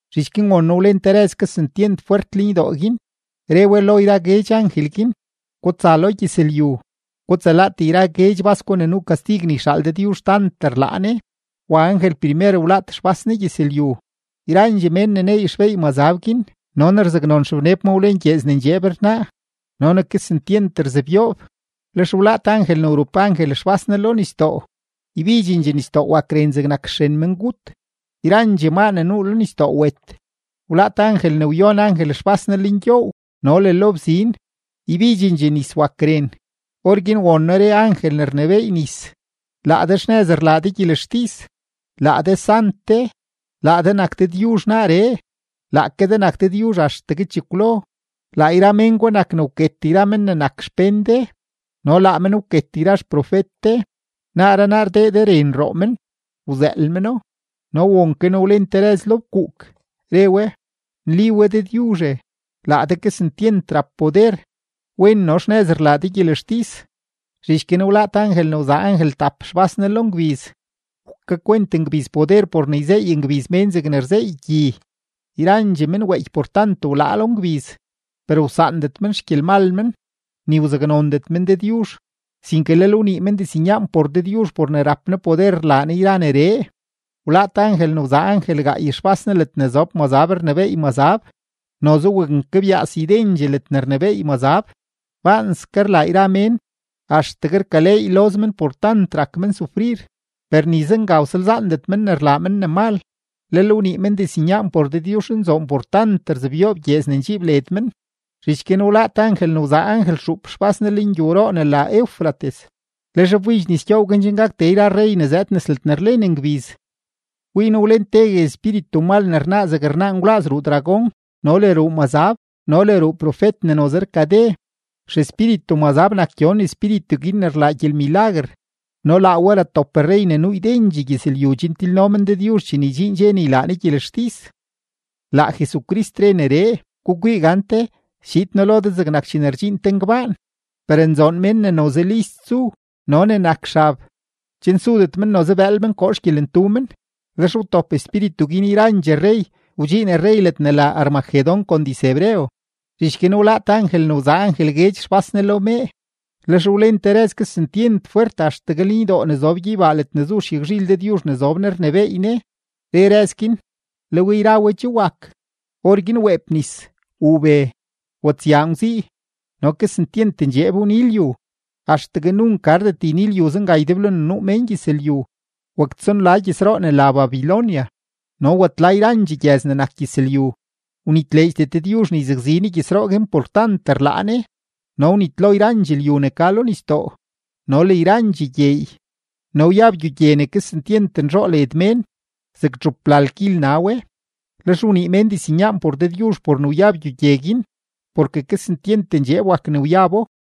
Zhich guin won noo wlen te rëz kesentyent fwert lenydoo guin, re we lo yra guedx angel guin: ―Gutsa lo gyëzlyu, gutsalaat yra guedx bas gwa ne nuu kastig ne yxaal Dëdyuzh tant rlaa Ne. Wa angel primer wlaat xbas ne gyëzlyu, yrandxee mén ne neey xbeey mazab guin no ne rzaknon xebneb ma wlen gyeez ne ndxeeb rnaa no ne kesentyent rzebyoob. Lex wlaat angel ne wrup angel xbas ne lo nisdoo, ybidxendxee nisdoo wak ren zegnak xren mengut, yrandxee maa ne nuu lo nisdoo wet. Wlaat angel ne wyon angel xbas ne lengyoow no le lo bzin, ybidxendxee nis wak ren. Orguin won noo re angel ne rnebééy nis: ―Laa de xnëz rlaa de gyelextis, laa de Sant de, laa de nak Dëdyuzh naaree, laake de nak Dëdyuzh axtegue chekwlo. Laa yra mén gwa nak ne wket yra mén ne nak xpén de no laa men wket yra xprofet de; naaree naa rdee de ren roo men; wzëël meno. No won ke noo wlen te rëz lo fkuuk, re we: ―Nli we Dëdyuzhe, laa de kesentyent rap poder; wen no xnëz rlaa de gyelextis. Zhich guin wlaat angel ne wzaa angel tap xbas ne lo ngbiz, wkakwent ngbiz poder por ne yzeey ngbiz mén zegne rzeey gyi. Yrandxee men weeky por tant wlaa lo ngbiz, per wsaandet men xgyelmal men, ni wzaknondet men Dëdyuzh, sinke lel wnii men diznyaan por Dëdyuzh por ne rap Ne poder rlaa Ne yra neree. Wlaat angel ne wzaa angel gaay xbas ne ledne zob mazab rnebééy mazab, noze waknkebyaas ydendxee ledne rnebééy mazab; baanske rlaa yra mén, axtegue rkaleey loz men por tant rak men sufrir. Per ni zenga wsalzaandet men ne rlaa men ne mal, lel wnii men diznyaan por Dëdyuzhnzoon por tant rzebyoob gyeez ne ndxiib led men. Zhich guin wlaat angel ne wzaa angel xuup xbas ne lengyowroo ne la Eufrates, lex wbidx nis gyoow guin chen gak tee yra rrey ne zëëd nes ledne rlen ngbiz. Wii noo wlen tegue espíritu mal ne rnaa zeg rnaa ngwlaaz ruu dragón no le ruu mazab no le ruu profet ne noze rkade. Xespíritu menzab nak gyon espíritu guin ne rlaa gyelmilaguer no laa we ratop rrey ne nuu ydendxee gyëzlyu chen tilno men Dëdyuzh chene ydxiin dxe ne ylaa Ne gyelextis. Laa Jesucrist re neree: ―Gukwii gante, schiid noo lo de zegnak chene rdxiin te ngbaan. Per nzoon mén ne noze list zu no ne nak xab, chen sudet men noze bëël men koo xgyelentu men. Lex wtop espíritu guin yrandxee rrey, wdxiin rrey ledne la Armagedón kon diz-hebreo. Zhich guin wlaat angel ne wzaa angel guedx xbas ne lo mee, lex wlen te rëz kesentyent fwert axtegue lenydoo ne zob gyeybaa ledne zu xyagzhil Dëdyuzh ne zob Ne rnebééy Ne, re rëz guin: ―Le we yra we che wak. Orguin weep nis, wuu be, watsyaa ngwzii, no kesentyent ndxeeb wni lyu, axtegue nunk gardet yni lyu zenga ydeblo ne nuu mén gyëzlyu. Waktsonla gyëzroo ne la Babilonia no watla yrandxee gyëz ne nak gyëzlyu; wnitleedxdet Dëdyuzh ne yzakzi Ne gyëzroo guin por tant rlaa Ne. No wnitlo yrandxee lyu ne ka lo nisdoo no le yrandxee gyeey. No wyab gyogye ne kesentyent nzhoo led mén, zeg txuplal kil na we. Lex wnii mén diznyaan por Dëdyuzh por ne wyab gyogye guin, porke kesentyent ndxeeb wak ne wyabo.